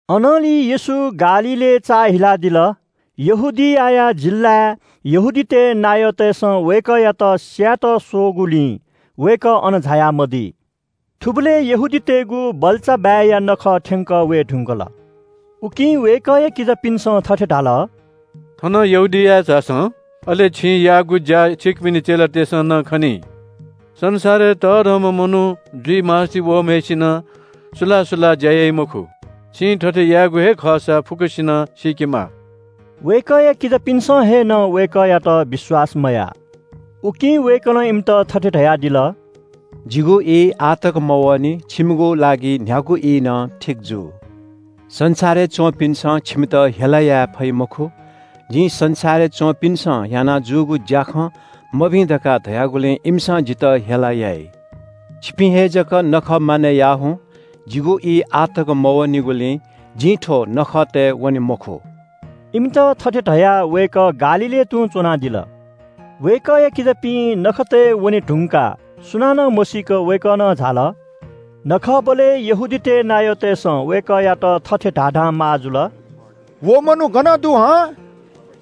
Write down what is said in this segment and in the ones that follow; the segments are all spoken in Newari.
अनंलि येशू गालीलय् चाःहिलादिल। यहूदिया जिल्‍लाय् यहूदीतय् नायःतय्‌सं वय्‌कःयात स्‍यायेत स्‍वःगुलिं वय्‌कः अन झाया मदी। थुबलय् यहूदीतय्‌गु बल्‍चाबाय्‌या नखः थ्‍यंकः वये धुंकल। उकिं वय्‌कःया किजापिन्‍सं थथे धाल – “थनं यहूदियाय् झासँ। अले छिं याःगु ज्‍या छिकपिनि चेलातय्‌सं नं खनी। संसारय् तःधंम्‍ह मनू जुइ मास्‍ति वःम्‍हय्‌सिनं सुलाः सुलाः ज्‍या याइ मखु। छिं थथे यायेगु हे खःसा फुक्‍कसिनं सीकेमा।” वय्‌कःया किजापिन्‍सं हे नं वय्‌कःयात विश्‍वास मयाः। उकिं वय्‌कलं इमित थथे धयादिल – “जिगु ई आः तक मवःनि। छिमिगु लागि न्‍ह्यागु ई नं ठीक जू। संसारय् च्‍वंपिन्‍सं छिमित हेला याये फइ मखु। जिं संसारय् च्‍वंपिन्‍सं याना जूगु ज्‍याखँ मभिं धकाः धयागुलिं इमिसं जितः हेला याइ। छिपिं हे जक नखः मानय् याः हुँ। जिगु ई आः तक मवःनिगुलिं जि थ्‍व नखःतय् वने मखु।” इमित थथे धयाः वय्‌कः गालीलय् तुं च्‍वनादिल। वय्‌कःया किजापिं नखःतय् वने धुंकाः सुनानं मसीक वय्‌कः नं झाल। नखःबलय् यहूदीतय् नायःतय्‌सं वय्‌कःयात थथे धाधां माः जुल – “व मनू गन दु हं?”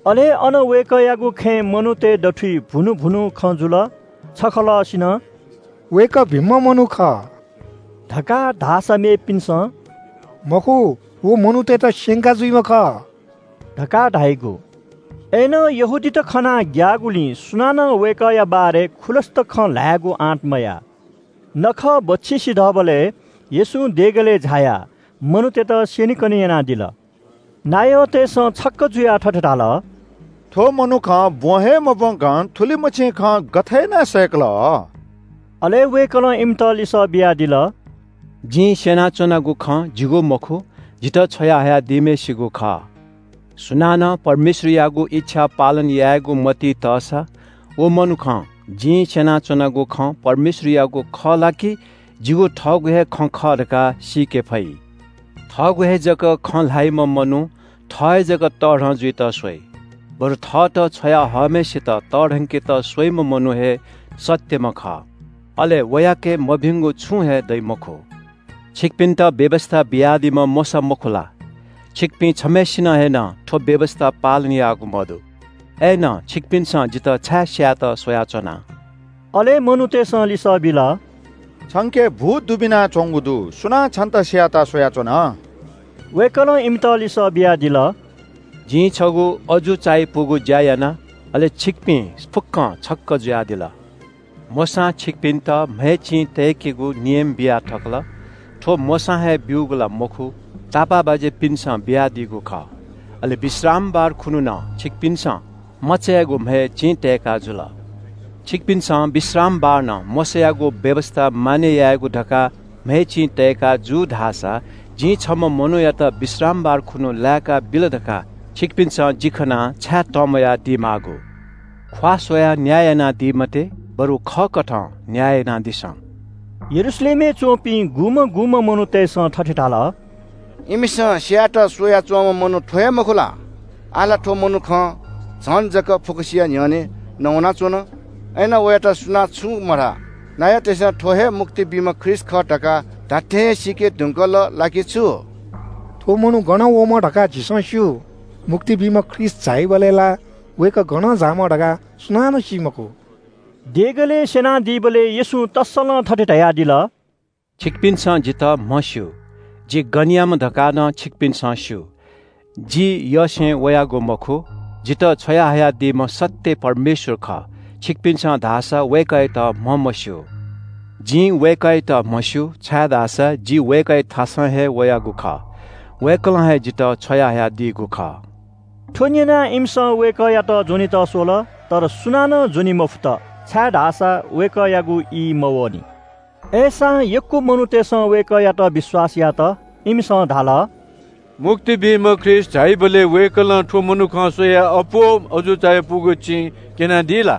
अले अन वय्‌कःयागु खँय् मनूतय् दथुइ भुनु भुनु खँ जुल। छखलःसिनं “वय्‌कः भिंम्‍ह मनू खः” धकाः धाःसा मेपिन्‍सं “मखु, व मनूतय्‌त स्‍यंका जुइम्‍ह खः” धकाः धाइगु। अय्‌नं यहूदीत खनाः ग्‍याःगुलिं सुनानं वय्‌कःया बारे खुलस्‍त खँ ल्‍हायेगु आँट मयाः। नखः बच्‍छि सिधःबलय् येशूं देगलय् झायाः मनूतय्‌त स्‍यनेकने यानादिल। नायःतय्‌सं छक्‍क जुयाः थथे धाल – “थ्‍व मनुखं ब्‍वँ हे मब्‍वंकं थुलिमछि खँ गथे यानाः सय्‌कल?” अले वय्‌कलं इमित लिसः बियादिल – “जिं स्‍यनाच्‍वनागु खँ जिगु मखु, जितः छ्वया हयादीम्‍हय्‌सित खः। सुनानं परमेश्‍वरयागु इच्‍छा पालन यायेगु मतिइ तःसा व मनुखं जिं स्‍यनाच्‍वनागु खँ परमेश्‍वरयागु खः ला कि जिगु थःगु हे खँ खः धकाः सीके फइ। थःगु हे जक खँ ल्‍हाइम्‍ह मनू थः हे जक तःधं जुइत स्‍वइ। बरु थःत छ्वया हःम्‍हय्‌सित तःधंकेत स्‍वइम्‍ह मनू हे सत्‍यम्‍ह खः। अले वयाके मभिंगु छुं हे दइ मखु। छिमित व्‍यवस्‍था बियादीम्‍ह मोशा मखु ला? छिपिं छम्‍हय्‌सिनं हे नं थ्‍व व्‍यवस्‍था पालन याःगु मदु। अय्‌नं छिमिसं जितः छाय् स्‍यायेत स्‍वयाच्‍वना?” अले मनूतय्‌सं लिसः बिल – “छंके भूत दुबिनाच्‍वंगु दु। सुनां छन्‍त स्‍यायेत स्‍वयाच्‍वन?” वय्‌कलं इमित लिसः बियादिल – “जिं छगू अजू चायापुगु ज्‍या याना, अले छिकपिं फुक्‍कं छक्‍क जुयादिल। मोशां छिकपिन्‍त म्‍हय् चिं तय्‌केगु नियम बिया थकल। थ्‍व मोशां हे ब्‍यूगु ला मखु, तापाःबाज्‍यापिन्‍सं बियादीगु खः। अले विश्रामबार खुन्‍हु नं छिकपिन्‍सं मचायागु म्‍हय् चिं तय्‌का जुल। छिकपिन्‍सं विश्रामबार नं मोशायागु व्‍यवस्‍था मानय् यायेगु धकाः म्‍हय् चिं तय्‌का जू धाःसा जिं छम्‍ह मनूयात विश्रामबार खुन्‍हु लाय्‌काबिल धकाः छिकपिन्‍स जि खनाः छाय् तंम्‍वयादी माःगु? ख्‍वाः स्‍वयाः न्‍याय यानादी मते, बरु खःकथं न्‍याय यानादिसँ।” यरूशलेमय् च्‍वंपिं गुम्‍हं गुम्‍हं मनूतय्‌सं थथे धाल – “इमिसं स्‍यायेत स्‍वया च्‍वंम्‍ह मनू थ्‍व हे, मखु ला? आः ला थ्‍व मनुखं झन जक फुक्‍कसिया न्‍ह्यःने नवानाच्‍वन। अय्‌नं वयात सुनां छुं मधाः। नायःतय्‌सं थ्‍व हे मुक्ति बीम्‍ह ख्रीष्‍ट खः धकाः धात्‍थें हे सीके धुंकल ला कि छु? थ्‍व मनू गनं वःम्‍ह धकाः झीसं स्‍यू। मुक्ति बीम्‍ह ख्रीष्‍ट झाइबलय् ला वय्‌कः गनं झाःम्‍ह धकाः सुनानं सी मखु।” देगलय् स्‍यनादीबलय् येशूं तस्‍सलं थथे धयादिल – “छिकपिन्‍सं जितः म्‍हस्‍यू, जि गनयाम्‍ह धकाः नं छिकपिन्‍सं स्‍यू। जि थःयसें वयागु मखु, जितः छ्वयाहयादीम्‍ह सत्‍य परमेश्‍वर खः, छिकपिन्‍सं धाःसा वय्‌कःयात म्‍हमस्‍यू। जिं वय्‌कःयात म्‍हस्‍यू, छाय्‌धाःसा जि वय्‌कःयाथासं हे वयागु खः। वय्‌कलं हे जितः छ्वयाहयादीगु खः।” थ्‍व न्‍यनाः इमिसं वय्‌कःयात ज्‍वनेत स्‍वल। तर सुनानं ज्‍वने मफुत, छाय्‌धाःसा वय्‌कःयागु ई मवःनि। अय्‌सां यक्‍व मनूतय्‌सं वय्‌कःयात विश्‍वास यात। इमिसं धाल – “मुक्ति बीम्‍ह ख्रीष्‍ट झाइबलय् वय्‌कलं थ्‍व मनुखं स्‍वयाः अप्‍वः अजू चायापुगु चिं क्‍यनादी ला?”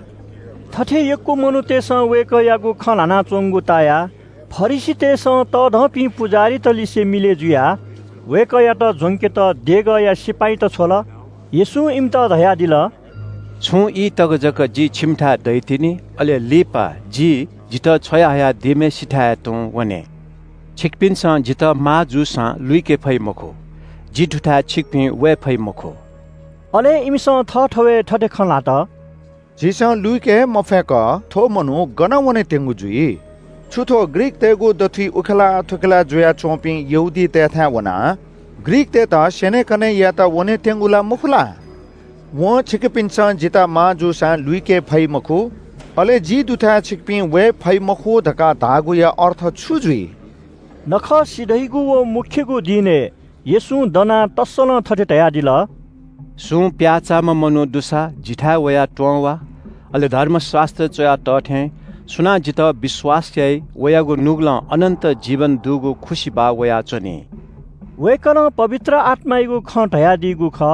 थथे यक्‍व मनूतय्‌सं वय्‌कःयागु खँ ल्‍हानाच्‍वंगु तायाः फरिसीतय्‌सं तःधंपिं पुजाहारीतलिसे मिलय् जुयाः वय्‌कःयात ज्‍वंकेत देगःया सिपाइँत छ्वल। येशूं इमित धयादिल – “छुं ई तक जक जि छिमिथाय् दइतिनि, अले लिपा जि जितः छ्वया हयादीम्‍हय्‌सिथाय् तुं वने। छिकपिन्‍सं जितः माः जूसां लुइके फइ मखु। जि दुथाय् छिकपिं वये फइ मखु।” अले इमिसं थःथवय् थथे खँ ल्‍हात – “झीसं लुइके हे मफय्‌क थ्‍व मनू गन वनेत्‍यंगु जुइ? छु थ्‍व ग्रीकतय्‌गु दथुइ उखेलाः थुखेलाः जुयाच्‍वपिं यहूदीतय्‌थाय् वनाः ग्रीकतय्‌त स्‍यनेकने यायेत वनेत्‍यंगु ला मखु ला? वं ‘छिकपिन्‍सं जितः माः जूसां लुइके फइ मखु’ अले ‘जि दुथाय् छिकपिं वये फइ मखु’ धकाः धाःगुया अर्थ छु जुइ?” नखः सिधइगु व मू दिनय् येशूं दनाः तस्‍सलं थथे धयादिल – “सुं प्‍याःचाःम्‍ह मनू दुसा जिथाय् वयाः त्‍वँ वा। अले धर्मशास्‍त्रय् च्‍वया तः थें – सुनां जितः विश्‍वास याइ, वयागु नुगलं अनन्‍त जीवन दुगु खुसिबाः वयाच्‍वनी।” वय्‌कलं पवित्र आत्‍मायागु खँ धयादीगु खः।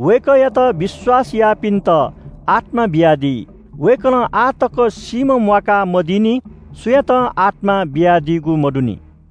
वय्‌कःयात विश्‍वास याःपिन्‍त आत्‍मा बियादी। वय्‌कलं आः तक सीम्‍ह म्‍वाका मदीनि सुयातं आत्‍मा बियादीगु मदुनि।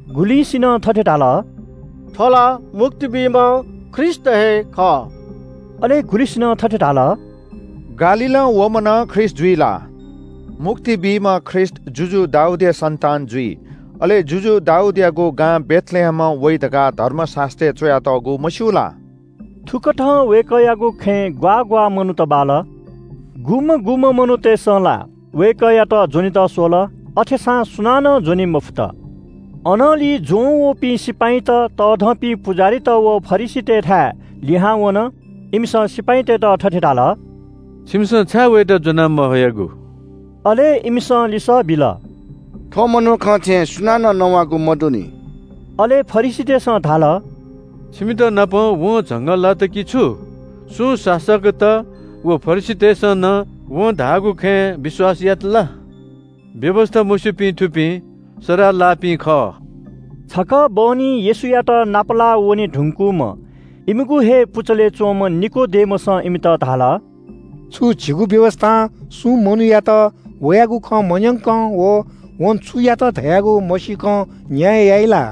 गुलिंसिनं थथे धाल – “थ्‍व ला मुक्ति बीम्‍ह ख्रीष्‍ट हे खः।” अले गुलिंसिनं थथे धाल – “गालीलं वःम्‍ह नं ख्रीष्‍ट जुइ ला? मुक्ति बीम्‍ह ख्रीष्‍ट जुजु दाऊदया सन्‍तान जुइ, अले जुजु दाऊदयागु गां बेथलेहेमं वइ धकाः धर्मशास्‍त्रय् च्‍वयातःगु मस्‍यू ला?” थुकथं वय्‌कःयागु खँय् ग्‍वाः ग्‍वाः मनूत बाल। गुम्‍हं गुम्‍हं मनूतय्‌सं ला वय्‌कःयात ज्‍वनेत स्‍वल, अथेसां सुनानं ज्‍वने मफु। अनंलि ज्‍वंवःपिं सिपाइँत तःधंपिं पुजाहारीत व फरिसीतय्‌थाय् लिहां वन। इमिसं सिपाइँतय्‌त थथे धाल – “छिमिसं छाय् वयात ज्‍वना महयागु?” अले इमिसं लिसः बिल – “थ्‍व मनुखं थें सुनानं नवाःगु मदुनि।” अले फरिसीतय्‌सं धाल – “छिमितनापं वं झंगः लात कि छु? सुं शासकत व फरिसीतय्‌सं नं वं धाःगु खँय् विश्‍वास यात ला? व्‍यवस्‍था मस्‍यूपिं थुपिं सराः लाःपिं खः।” छकः बहनी येशूयात नापलाः वने धुंकूम्‍ह इमिगु हे पुचलय् च्‍वंम्‍ह निकोदेमसं इमित धाल – “छु झीगु व्‍यवस्‍थां सुं मनूयात वयागु खँ मन्‍यंकं व वं छु यात धयागु मसीकं न्‍याय याइ ला?”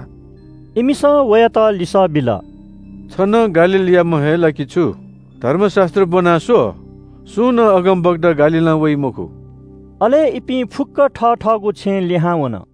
इमिसं वयात लिसः बिल – “छ नं गालीलयाम्‍ह हे ला कि छु? धर्मशास्‍त्र ब्‍वनाः स्‍व, सुं नं अगमवक्ता गालीलं वइ मखु।” [अले इपिं फुक्‍क थथःगु छेँय् लिहां वन।